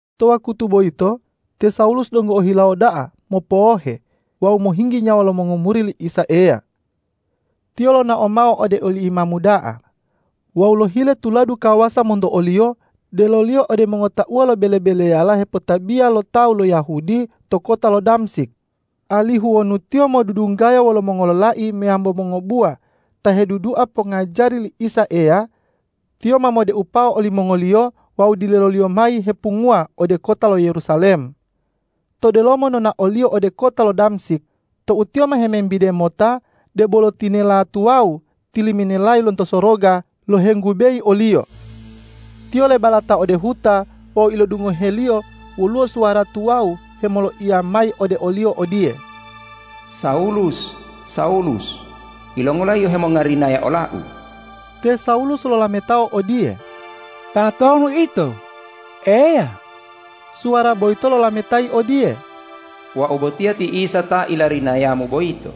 To wakutu boyito te Sawulus donggo ohilawo da'a mopowohe wawu mohinggi nyawa lo mongomuri li Isa Eya. Tiyo lonao mao ode oli imamu da'a wawu lohile tuladu kawasa monto oliyo deloliyo ode mongotauwa lo bele-beleyala hepotabiya lo tawu lo Yahudi to kota lo Damsik, alihu wonu tiyo modudunggaya wolo mongololai meyambo mongobuwa ta hedudua pongajari li Isa Eya, tiyo ma modeupao olimongoliyo wawu dileloliyo mayi hepunguwa ode kota lo Yerusalem. To delomo nonaoliyo ode kota lo Damsik tou tiyo ma hemembide mota, debolo tinela tuwawu tiliminelayi lonto soroga lohenggubeyi oliyo. Tiyo lebalata ode huta wawu ilodungoheliyo woluwo suwara tuwawu hemoloiya mayi ode oliyo odiye,”Sawulus, Sawulus! Yilongola yio hemongarinaya ola-U?” Te Sawulus lolametao odiye,”Tatonu Ito, Eya?” Suwara boyito lolametayi odiye,”Wau botiya ti Isa ta ilarinayamu boyito.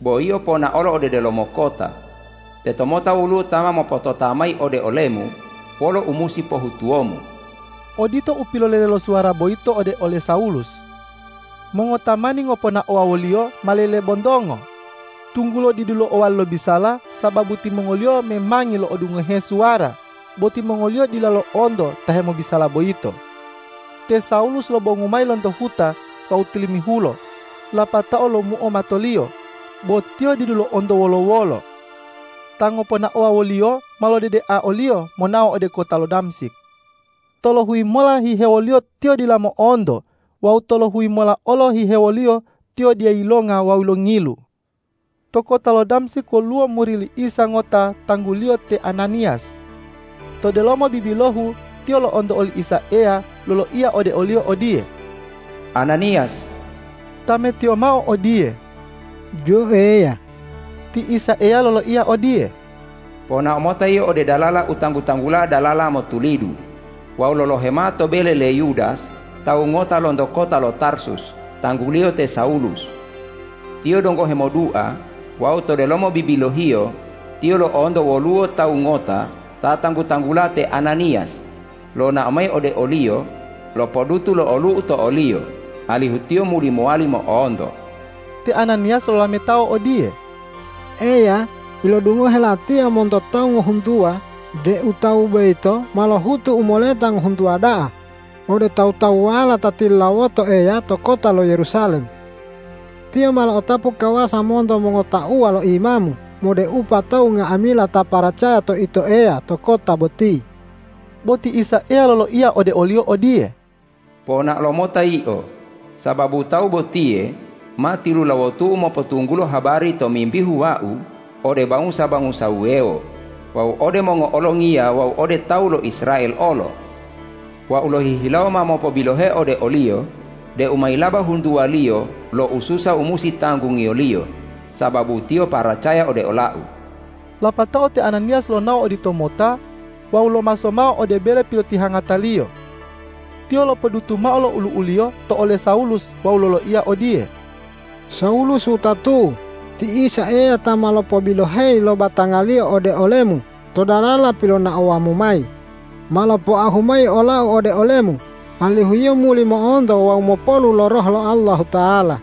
Bo yio ponaolo ode delomo kota. Tetomota woluwo ta ma mopotota mayi ode olemu wolo u musi pohutuwomu.” Odito u pilolele lo suwara boyito ode ole Sawulus. Mongotamani ngoponaowa woliyo ma lelebontongo, tunggulo didu lo'owali lobisala sababu timongoliyo memangi lo'odungohe suwara, bo timongoliyo dila lo'onto ta hemobisala boyito. Te Sawulus lobongu mayi lonto huta wawu tilimihulo, lapatao lomuo matoliyo, bo tiyo didu lo'onto wolo-wolo. Ta ngoponaowa woliyo ma lodedea oliyo monao ode kota lo Damsik. Tolohuyi mola hihewoliyo tiyo dila mo'onto wawu tolohuyi mola olo hihewoliyo tiyo dila yilonga wawu longilu. To kota lo Damsik woluwo muri li Isa ngota tangguliyo te Ananiyas. To delomo bibilohu tiyo lo'onto oli Isa Eya loloiya ode oliyo odiye,”Ananiyas!” Tametiyo mao odiye,”Jo Eya!” Ti Isa Eya loloiya ode odiye,”Ponao mota yio ode dalala u tanggu-tanggula Dalala Motulidu wawu lolohe mao to bele le Yudas tawu ngota lonto kota lo Tarsus tangguliyo te Sawulus. Tiyo donggo hemodua wawu to delomo bibilohiyo tiyo lo'onto woluwo tawu ngota ta tanggu-tanggula te Ananiyas lonao mayi ode oliyo lopodutu lo olu'u to oliyo, alihu tiyo muli mowali mo'onto.” Te Ananiyas lolametao odiye,”Eya, ilodungohe latiya monto tawu ngohuntuwa deu tawu boyito ma helohutu u moleta ngohuntuwa da'a ode tawu-tawuwala ta tilulawoto Eya to kota lo Yerusalem. Tiyo ma lo'otapu kawasa monto mongotauwa lo imamu modeupa tawu nga'amila ta paracaya to Ito Eya to kota boti.” Bo ti Isa Eya loloiya ode oliyo odiye,”Ponao lomota yio, sababu tawu botiye ma tilulawotu-U mopotunggulo habari tomimbihu Wau ode bangusa-bangusa wuwewo wawu ode mongo'olongiya wawu ode tawu lo Israel olo. Wau lohihilawo ma mopobiloheo ode oliyo deu mayilaba huntuwaliyo lo ususa u musi tanggungiyoliyo sababu tiyo paracaya ode ola-U.” Lapatao te Ananiyas lonao oditomota wawu lomaso mao ode bele pilotihangataliyo. Tiyo lopodutu mao lo ulu'uliyo to ole Sawulus wawu loloiya odiye,”Sawulus wutatu'u, ti Isa Eya ta ma lopobiloheyi lo batanga-Liyo ode olemu to dalala pilonaowamu mayi, ma lopoahu mayi olau ode olemu, alihu yio muli mo'onto wawu mopolu lo Roh lo Allahuta'ala.”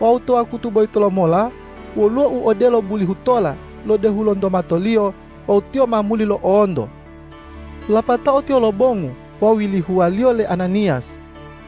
Wawu to wakutu boyito lomola woluwo u odelo bulihu tola lodehu lonto matoliyo wawu tiyo ma muli lo'onto. Lapatao tiyo lobongu wawu yilihuwaliyo le Ananiyas.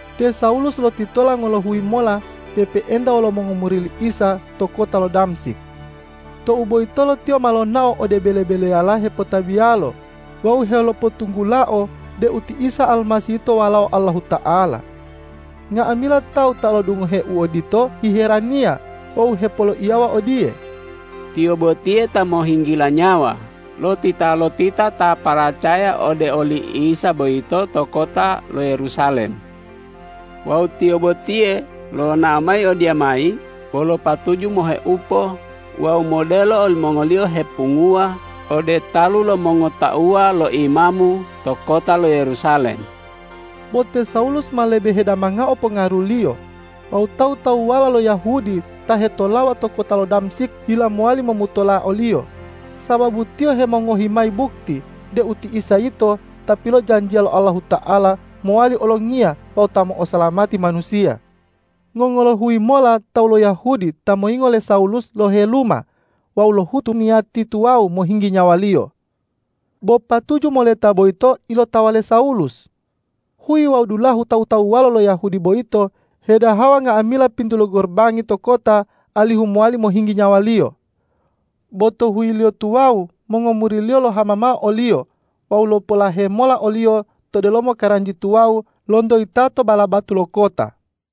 Te Sawulus lotitola ngolohuyi mola pe'epe'enta wolo mongomuri li Isa to kota lo Damsik. Tou boyitolo tiyo ma lonao ode bele-beleyala hepotabiyalo wawu helopotunggulao deu ti Isa Almasih yito Walao Allahuta'ala. Nga'amila tawu ta lo'odungohe u odito hiheraniya wawu hepoloiyawa odiye,”Tiyo botiye ta mohinggila nyawa lo titalotita ta paracaya ode oli Isa boyito to kota lo Yerusalem. Wawu tiyo botiye lonao mayi odiyamayi wolo patuju moheupo wawu modelo olimongoliyo hepunguwa ode talu lo mongotauwa lo imamu to kota lo Yerusalem.” Bo te Sawulus ma lebe hedamangao pongaruliyo wawu tawu-tawuwala lo Yahudi ta hetolawa to kota lo Damsik dila mowali momutola oliyo, sababu tiyo hemongohi mayi bukti deu ti Isa yito Ta pilojanjiya lo Allahuta'ala mowali Olongiya wawu Ta mo'osalamati manusiya. Ngongolohuyi mola tawu lo Yahudi ta moyingo le Sawulus loheluma wawu lohutu niyati tuwawu mohinggi nyawaliyo. Bo patuju moleta boyito ilotawa le Sawulus. Huyi wawu dulahu tawu-tawuwala lo Yahudi boyito hedahawa nga'amila pintu lo gorobangi to kota alihu mowali mohinggi nyawaliyo. Bo to huyiliyo tuwawu mongomuriliyo lohama mao oliyo wawu lopolahe mola oliyo to delomo karanji tuwawu lonto yitato bala batu lo kota.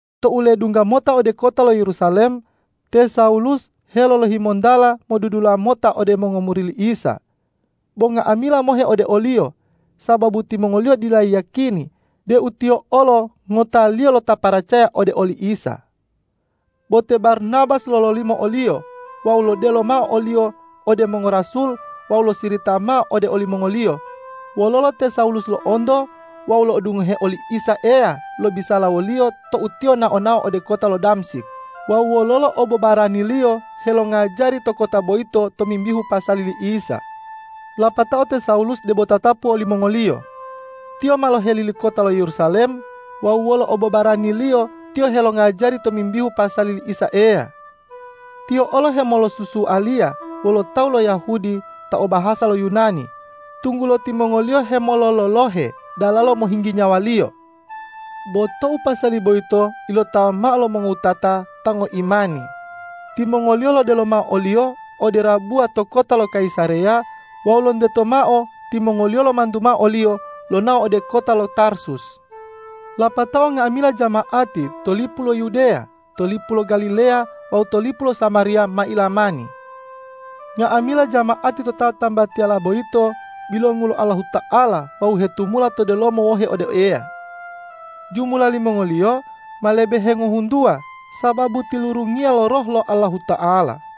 Tou ledungga mota ode kota lo Yerusalem, te Sawulus helolohimontala modudula mota ode mongomuri li Isa, bo nga'amila mohe ode oliyo, sababu timongoliyo dila yiyakini deu tiyo olo ngotaliyo lo ta paracaya ode oli Isa. Bo te Barnabas lololimo oliyo wawu lodelo mao oliyo ode mongorasul wawu losirita mao ode olimongoliyo wololo te Sawulus lo'onto wawu lo'odungohe oli Isa Eya lobisala woliyo tou tiyo nao-nao ode kota lo Damsik wawu wololo obobaraniliyo helongajari to kota boyito tomimbihu pasali li Isa. Lapatao te Sawulus debo tatapu wolimongoliyo. Tiyo ma lohelili kota lo Yerusalem wawu wolo obobaraniliyo tiyo helongajari tomimbihu pasali li Isa Eya. Tiyo olo hemolosusualiya wolo tawu lo Yahudi ta o bahasa lo Yunani, tunggulo timongoliyo hemolololohe dalalo mohinggi nyawaliyo. Bo tou pasali boyito ilotawa mao lo mongowutata ta ngoimani, timongoliyo lodelo mao oliyo ode rabuwa to kota lo Kayisareya wawu lonteto mao timongoliyo lomantu mao oliyo lonao ode kota lo Tarsus. Lapatao nga'amila jama'ati to lipu lo Yudeya, to lipu lo Galileya wawu to lipu lo Samariya ma ilamani. Nga'amila jama'ati to tatambatiyala boyito bilongu lo Allahuta'ala wawu hetumula to delomo wohe ode Eya. Jumula limongoliyo ma lebe hengohuntuwa sababu tilurungiya lo Roh lo Allahuta'ala.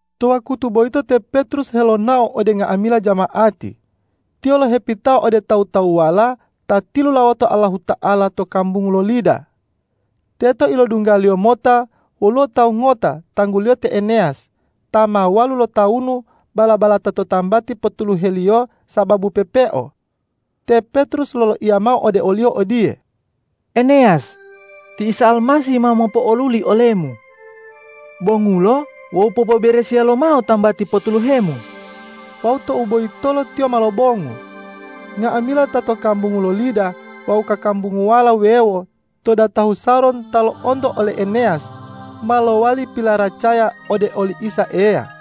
To wakutu boyito te Petrus helonao ode nga'amila jama'ati.Tiyo lohepitao ode tawu-tawuwala ta tilulawoto Allahuta'ala to kambungu lo Lida. Teto ilodunggaliyo mota woluwo tawu ngota tangguliyo te Eneyas ta ma walu lotawunu bala-balata to tambati pottuluheliyo sababu pepeo. Te Petrus loloiya mao ode oliyo odiye,”Eneyas, ti Isa Almasih ma mopo'oluli olemu. Bongulo wawu popoberesiya lomao tambati pottuluhemu!” Wawu tou boyitolo tiyo ma lobongu. Nga'amila ta to kambungu lo Lida wawu kakambunguwala wuwewo to datahu Saron ta lo'onto ole Eneyas, ma lowali pilaracaya ode oli Isa Eya.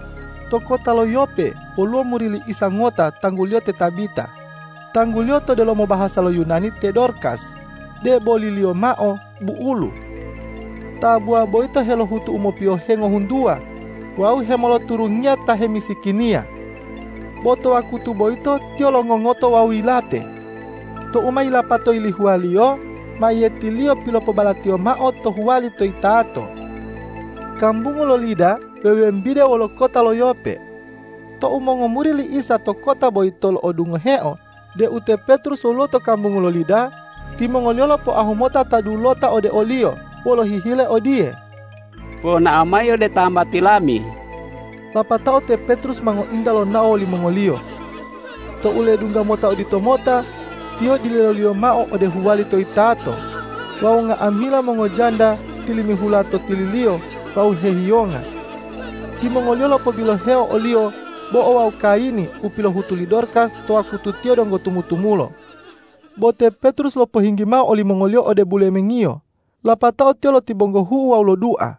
To kota lo Yope woluwo muri li Isa ngota tangguliyo ti Tabita. Tangguliyo to delomo bahasa lo Yunani ti Dorkas, deboliliyo mao bu'ulu. Tabuwa boyito helohutu u mopiyohe ngohuntuwa wawu hemoloturungiya ta hemisikiniya. Bo to wakutu boyito tiyo longongoto wawu yilate. Tou ma yilapato yilihuwaliyo, mayiyetiliyo pilopobalatiyo mao to huwali to yitato. Kambungu lo Lida wewembide wolo kota lo Yope. Tou mongomuri li Isa to kota boyito lo'odungoheo deu te Petrus woluwo to kambungu lo Lida, timongoliyo lopoahu mota ta dulota ode oliyo wolo hihile odiye,”Ponao mayi ode tambati lami.” Lapatao te Petrus ma ngointa lonao wolimongoliyo. Tou ledungga mota oditomota, tiyo dileloliyo mao ode huwali to yitato wawu nga'amila mongojanda tilimihula to tililiyo wawu hehiyonga. Timongoliyo lopobiloheo oliyo bo'o wawu kayini u pilohutu li Dorkas to wakutu tiyo donggo tumu-tumulo. Bo te Petrus lopohinggi mao olimongoliyo ode bulemengiyo, lapatao tiyo lotibonggohu'u wawu lodua.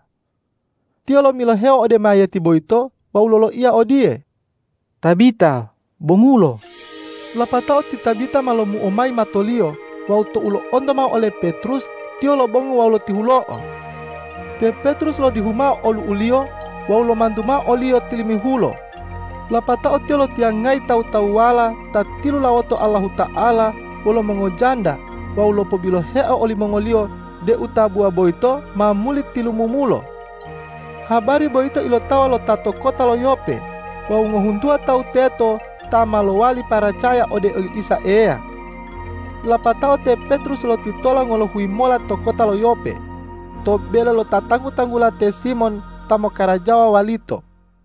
Tiyo lomiloheo ode mayiyeti boyito wawu loloiya odiye,”Tabita, bongulo!” Lapatao ti Tabita ma lomuo mayi matoliyo wawu tou lo'onto mao ole Petrus, tiyo lobongu wawu lotihulo'o. Te Petrus lodihu mao olu'uliyo wawu lomantu mao oliyo tilimihulo. Lapatao tiyo lotiyangayi tawu-tawuwala ta tilulawoto Allahuta'ala wolo mongojanda wawu lopobiloheo olimongoliyo deu tabuwa boyito ma muli tilumumulo. Habari boyito ilotawa lo ta to kota lo Yope wawu ngohuntuwa tawu teto ta ma lowali paracaya ode oli Isa Eya. Lapatao te Petrus lotitola ngolohuyi mola to kota lo Yope, to bele lo ta tanggu-tanggula te Simon ta mokkarajawa walito.